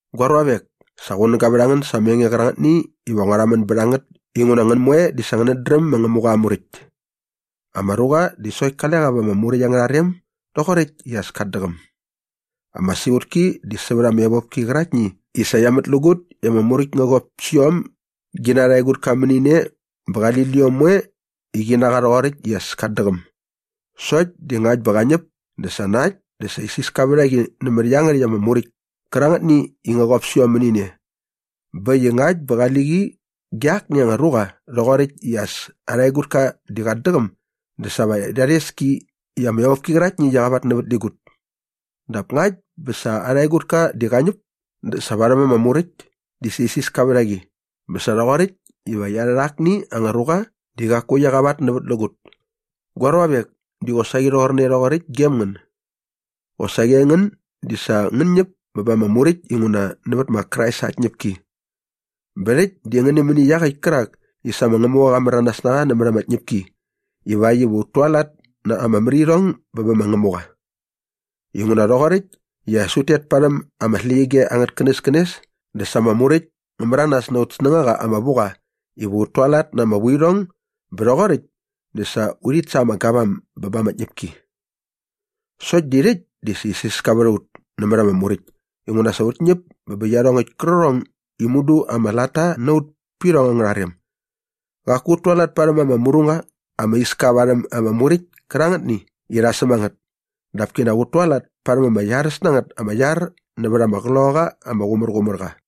Gua ruavek, sa qunäga vät ngän sa ama enge qärangätni iva ngua rhamän bät a ngät inguna ngän moe di sa ngänät dräm ma Ngämuqa aa Muräkt. Ama ruqa di sokt kale qa va ama Muräkt angärha rem doqoräkt i as kat däqäm. Ama siqutki di sävät ama evopki qäraktni i sa qia mätlägut i ama Muräkt ngä qop sä iom gi na arha egutka mäni ne bä qali liom moe qi na qa rhoqoräkt i as kat däqäm. Sokt di ngakt bä qä ñäp dä sa na äkt dä sa isiska vät a qi nämät iangärhäkt ama Muräkt kärangätni i ngä qop sä iom mäni ne. Bä äkt i ngakt bä qali qi ge akni anga ruqa rhoqoräkt i as arha egutka di qat däqäm dä sa va rha rhes ki i ama evopki qäraktni i qia qavatnävätlägut. Dap ngakt bä sa arha egutka di qa ñäp dä sa varhäm ama Muräkt di sa isiska vät a qi bä sa rhoqoräkt iva qia rhät akni anga ruqa di qaku qia qavatnävätlägut. Gua ruavek, di qosaqi rhoqorne rhoqoräkt gem ngän. Qosaqi aingän di sa ngän ñäp bä ba ama Muräkt inguna nävät ma Krais aa tñäpki. Bä rhäkt di ngän nämäni iaqäkt kärak i sa ma Ngämuqa qa märanas na qa nämät ama tñäpki ivakt iva ut tualat na ama märirhong bä bä ma Ngämuqa. Inguna rhoqoräkt i as ut tet parhäm ama släqyige angät känäskänes dä sa ama Muräkt ngä märanas na aut snängaqa ama vu qa iva ut tualat na ama vuirhong bä rhoqoräkt di sa urhit sa ama gavam bä ba ama tñäpki. Sokt di rhäkt di isiska vät a ut nämät ama Muräkt inguna sa ut ñäp bä bä iarhongäkt kärqärhong i mudu ama latta na ut pä irhong angärha rem. Qaku ut tualat parhäm ama mru qa ama iska varhäm ama Muräkt kärangätni i rha säm a ngät. Dap kinak ut tualat parhäm ama iaräs na ngät ama iar nävät ama Qloqaqa ama Qumärqumärqa.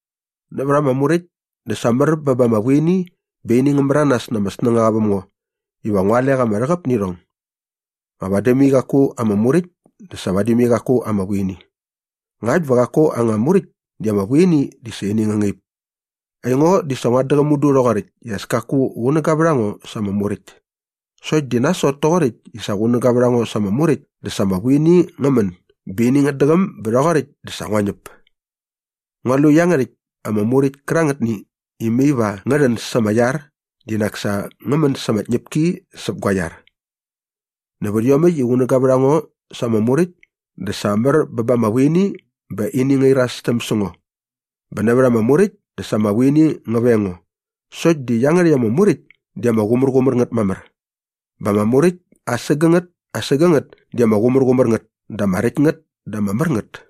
Nävät ama Muräkt dä sa mär bä ba ama vuini bä ini ngä märanas na ama snängaqa väm ngo iva ngu alek ama rhäqäp nä irhong. Nga vadi mai qaku anga Muräkt dä sa vadi mai qaku anga vuini. Ngakt bä qaku anga Muräkt di ama vuini di sa ini ngä ñäp. Aingo di sa nguat däqäm mudu rhoqoräkt i as kaku qunäga vät a ngo sa ama Muräkt. Sokt di nasot toqoräkt i sa qunäga vät a ngo sa ama Muräkt dä sa ama vuini ngä män bä ini ngät däqäm bä rhoqoräkt dä sa ngua ñäp. Ngua lu i iangärhäkt ama Muräkt kärangätni i mai va ngä rhän sa ama iar di nak sa ngä män sa ama tñäpki säp gua iar. Nävät iomäkt i qunäga vät a ngo sa ama Muräkt dä sa mär bä ba ama vuini bä ini ngärhi irastäm sä ngo. Bä nävät ama Muräkt dä sa ama vuini ngä veng ngo. Sokt di iangärhäkt ama Muräkt di ama qumärqumär ngät mamär. Bä ama muräkt asägängät asägängät di ama qumärqumär ngät dä ama räkt ngät dä ama mär ngät.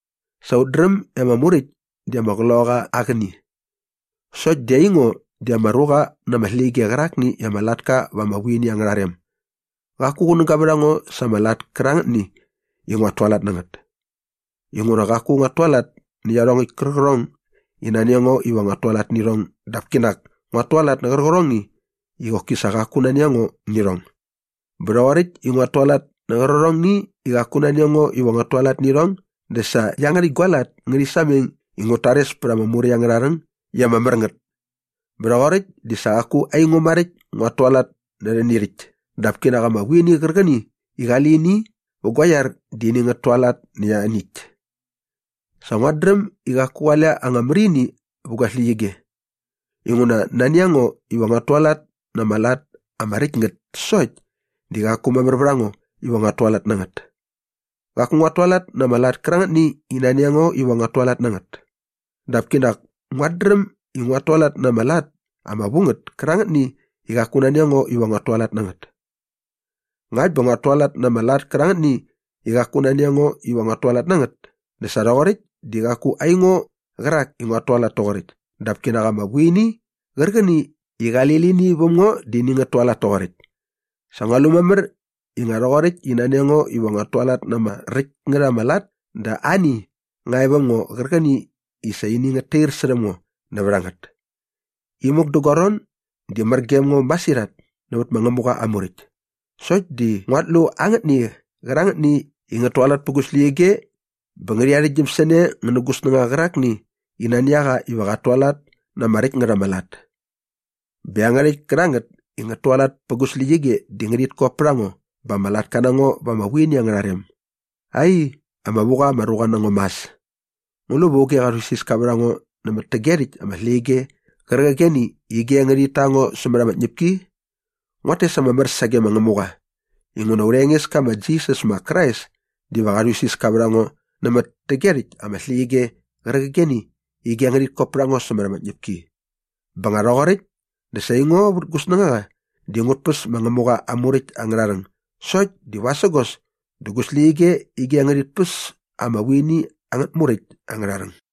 Sa ut dräm i ama Muräkt di ama qloqaqa aa qäni. Sokt di aingo di ama ruqa na ama släqyige qärakni i ama latka va ama vuini angärha rem. Qaku qunäga vät a ngo sa ama lat kärangätni i nguat tualat nä ngät. Inguna qaku nguat tualat nä iarhongäkt kärqärhong i nani a ngo iva nguat tualat nä irhong dap kinak nguat tualat nä qärqärhongni i qoki sa qaku nani a ngo nä irhong. Bä rhoqoräkt i nguat tualat nä qärqärhongni i qaku nani a ngo iva nguat tualat nä irhong dä sa iangärhäkt gua lat ngärhi sameng i ngut tares pät ama Muräkt angärha rhäng i ama mär ngät. Bä rhoqoräkt dä sa qaku aingo maräkt i nguat tualat nä rhäni rhäkt dap kinak ama vuini qärqäni i qali lini vä gua iar di ini ngät tualat nä ianiäkt. Sa nguat dräm i qaku qale anga märini vä gu släqyige. Inguna nani a ngo iva nguat tualat na ama lat ama räkt ngät sokt di qaku mamär vät a ngo iva nguat tualat nä ngät. Qaku nguat tualat na ama lat kärangätni i nani a ngo iva nguat tualat na ngät. Dap kinak nguat dräm nguat tualat na ama lat ama vu ngät kärangätni i qaku nani a ngo iva nguat tualat na ngät. Ngakt bä nguat tualat na ama lat kärangätni i qaku nani a ngo iva nguat tualat na ngät dä sa rhoqoräkt di qaku aingo qärak i nguat tualat toqoräkt dap kinak ama vuini qärqäni i qali lini väm ngo di ini ngät tualat toqoräkt. Sa ngua lu mamär i nga rhoqoräkt i nani a ngo iva nguat tualat na ama räkt ngät ama lat dä ani nga e väm ngo qärqäni i sa ini ngät tair särhäm ngo nävät a ngät. Imuk dä gua ron di mär gem ngo masirhat nävät ma Ngämuqa aa Muräkt. Sokt di nguat lu angätni qärangätni i ngät tualat pä gu släqyige bä ngärhi arhäktgyäm sä ne ngä nä gu snängaqa qärakni i nani a qa iva qat tualat na ama räkt ngät ama lat. Bä iangärhäkt kärangät i ngät tualat pä gu släqyige di ngärhit kop pät a ngo bä ama latka na ngo va ama vuini angärha rem. Ai, ama vu qa ama ruqa na ngo mas! Ngu lu va auge qa rhuisiska vät a ngo nämät täge rhäkt ama släqyige qärqigeni i ige ngärhit ta ngo sämät ama tñäpki? Nguat tes ama mär sage ma Ngämuqa inguna aurha Engeska ma Jisas ma Krais diva qa rhuisiska vät a ngo nämät täge rhäkt ama släqyige qärqigeni i ige ngärhit ta ngo sämät ama tñäpki. Bä nga rhoqoräkt dä sa aingo vät gu snängaqa di ngut päs ma Ngämuqa aa Muräkt angärha rhäng sokt di vasägos dä gu släqyige di ige ngärhit päs ama vuini angät muräkt angärha rhäng.